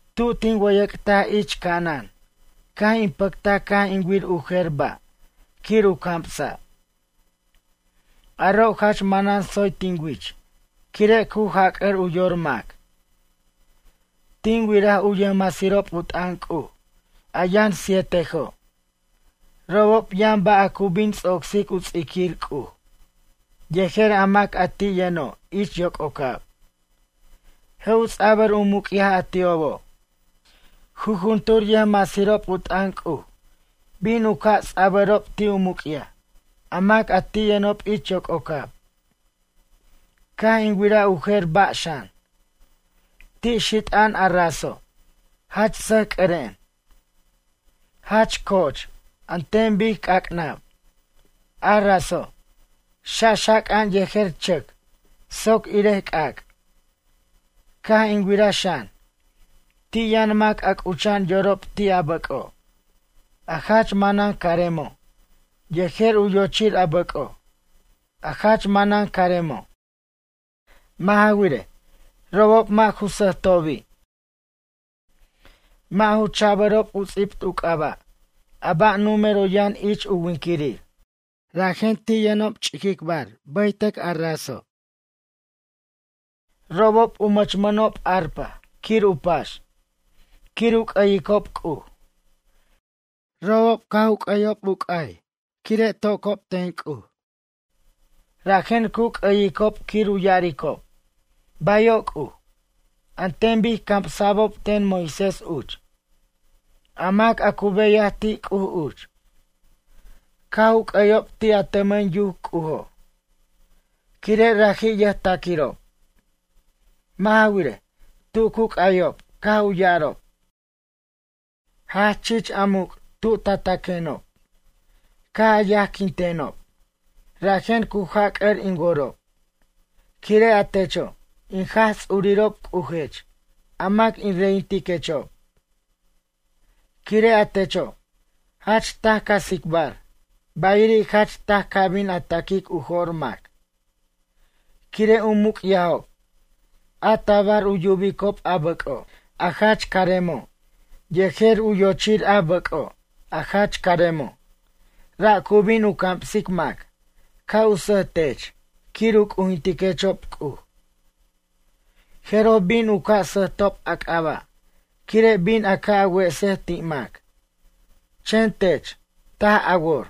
Tu tin wʌyʌc'taj ich ca'anan caj in pʌctaj caj in wir u jer ba' quir u camsa'. Aro' jach manan tsoy tin wich, quire' cu jac'ʌr u yor mac. Tin wiraj u yʌjmasirob u t'ʌn C'uj a yʌn sietejo'. Robob yʌn ba' a cu bin ts'ocsic u ts'iquir C'uj yejer a mac a ti' yʌno' ich yoc'ocab, je' u ts'abʌr u muc'yaj a ti'obo'. Jujuntur yʌjmasirob u t'ʌn C'uj bin u ca' ts'abʌrob ti' u muc'yaj a mac a ti' yʌnob ich yoc'ocab. Caj in wiraj u jer ba' xan. Ti' xit'a'an a raso', jach sasc'ʌren, jach co'och an ten bic c'ac'nab. A raso', xaxac'a'an yejer chʌc soc irej c'ac'. Caj in wiraj xan, ti' yʌn mac a c'ucha'an yorob ti' a bʌc'o', a jach manan caremo' yejer u yochir a bʌc'o', a jach manan caremo'. Mʌ' ja wirej, robob mʌ' ju sʌjtobi', mʌ' ju cha'bʌrob u ts'ibt u c'aba' a ba' numero yʌn ich u winquirir, rajen ti' yʌnob ch'iquicbar bʌytʌc a raso'. Robob u mʌchmʌnob arpa quir u pax, quir u c'ʌyicob C'uj. Robob caj c'aynʌjob u c'ay quire' tacbirob ten C'uj, rajen cu c'ʌyicob quir ya'aricob: “Bayo' C'uj”, an ten bic camsa'bob ten Moisés uch, a mac a cu beyaj ti' C'uj uch. Caj u c'ʌyob ti' a tʌmʌn yuc C'ujo', quire' raji' yʌjtaquirob. Mʌ' ja wirej, tu cu c'ayob caj u ya'arob: Jach chich a muc' tu ta taquenob, caj a yajquintenob rajen cu jac'ʌr in worob. Quire' a techo', in Jaj Ts'urirob C'ujech, a mac in reyintiquechob. Quire' a techo', jach taj ca tsicbar, bayiri' jach taj ca bin a taquic u jo'r mac. Quire' u muc'yajob a tabar u yubicob a bʌc'o', a jach caremo' yejer u yochir a bʌc'o' a jach caremo', ra' cu bin u camsic mac ca' u sʌjtech quir u c'ujintiquechob C'uj. Jeroj bin u ca' sʌjtob a c'aba' quire' bin a ca' a wesej ti' mac, chen tech taj a wor.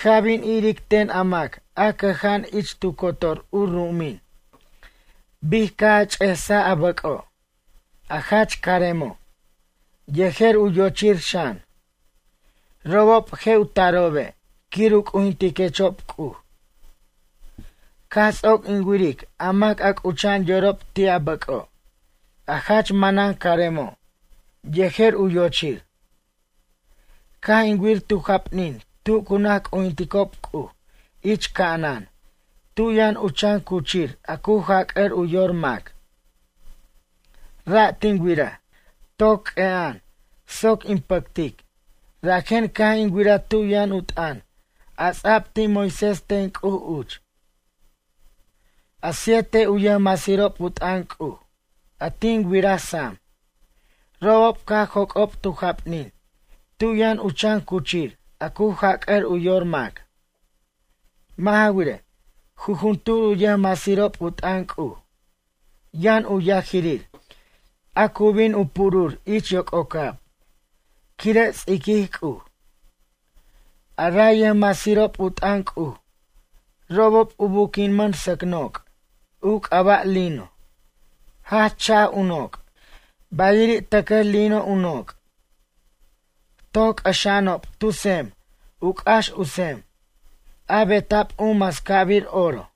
Ca' bin iric ten a mac a cʌja'an ich tu cotor u ru'umin bic caj a ch'esaj a bʌc'o', a jach caremo', yejer u yochir xan. Robob je' u tarobe' quir u c'ujintiquechob C'uj. Caj ts'oc in wiric a mac a c'ucha'an yorob ti' a bʌc'o' a jach manan caremo' yejer u yochir. Caj in wir tu japnin tu cu naj c'ujinticob C'uj ich ca'anan tu yʌn u chan cuchir a cu jac'ʌr u yor mac. Ra' tin wiraj, toc q'ue'a'an soc in pʌctic, rajen caj in wiraj tu yʌn u t'ʌn a ts'ab ti' Moisés ten C'uj uch. A siete u yʌjmasirob u t'ʌn C'uj a tin wiraj sam, robob caj joc'ob tu japnin tu yʌn u chan cuchir a cu jac'ʌr u yor mac. Mʌ' ja wirej, jujuntur u yʌjmasirob u t'ʌn C'uj yʌn u yajirir a cu bin u purur ich yoc'ocab, quire' ts'iquij C'uj. A ray yʌjmasirob u t'ʌn C'uj, robob u buquinmʌn sʌc noc' u c'aba' lino, jach cha'aj u noc', bayiri' tʌcaj lino u noc'. Toc c'ʌxa'anob tu tsem u c'ax u tsem, a beta'b u mascabir oro.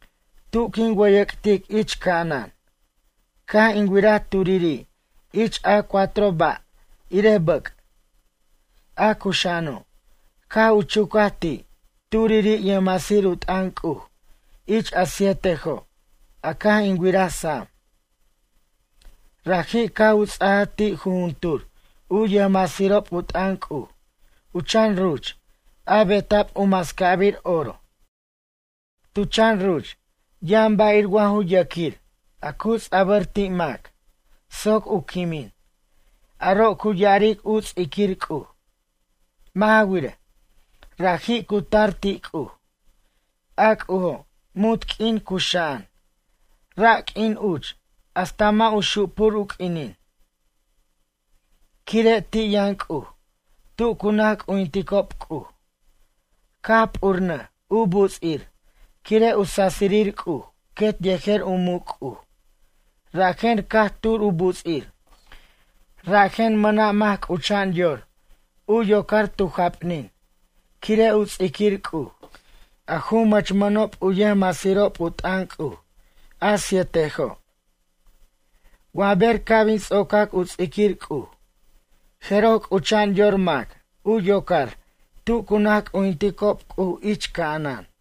Tu quin wʌyʌc'tic ich ca'anan, caj in wiraj turiri' ich a cuatro ba' irej bʌc', a cuxa'ano', caj u chucaj ti' turiri' yʌjmasir u t'ʌn C'uj ich a sietejo' a caj in wiraj sam. Raji' caj u ts'ajaj ti' jujuntur u yʌjmasirob u t'ʌn C'uj u chan ruch a beta'b u mascabir oro. Tu chan ruch yʌn ba' ir wa ju yʌquir a cu ts'abʌr ti' mac soc u quimin, aro' cu ya'aric u ts'iquir C'uj. Mʌ' ja wirej, raji' cu tar ti' C'uj, a C'ujo' munt q'uin cuxa'an, ra q'uin uch hasta mʌ' u xupur u q'uinin. Quire' ti' yʌn C'uj tu cu naj c'ujinticob C'uj, caj p'urnʌj u buts'ir quire' u sasirir C'uj quet yejer u muc' C'uj rajen caj tur u buts'ir. Rajen mʌna' mac c'ucha'an yor u yocar tu japnin quire' u ts'iquir C'uj, a ju mʌchmʌnob u yʌjmasirob u t'ʌn C'uj, a sietejo'. Wa ber ca' bin ts'ocac u ts'iquir C'uj, jeroj c'ucha'an yor mac u yocar tu cu naj c'ujinticob C'uj ich ca'anan.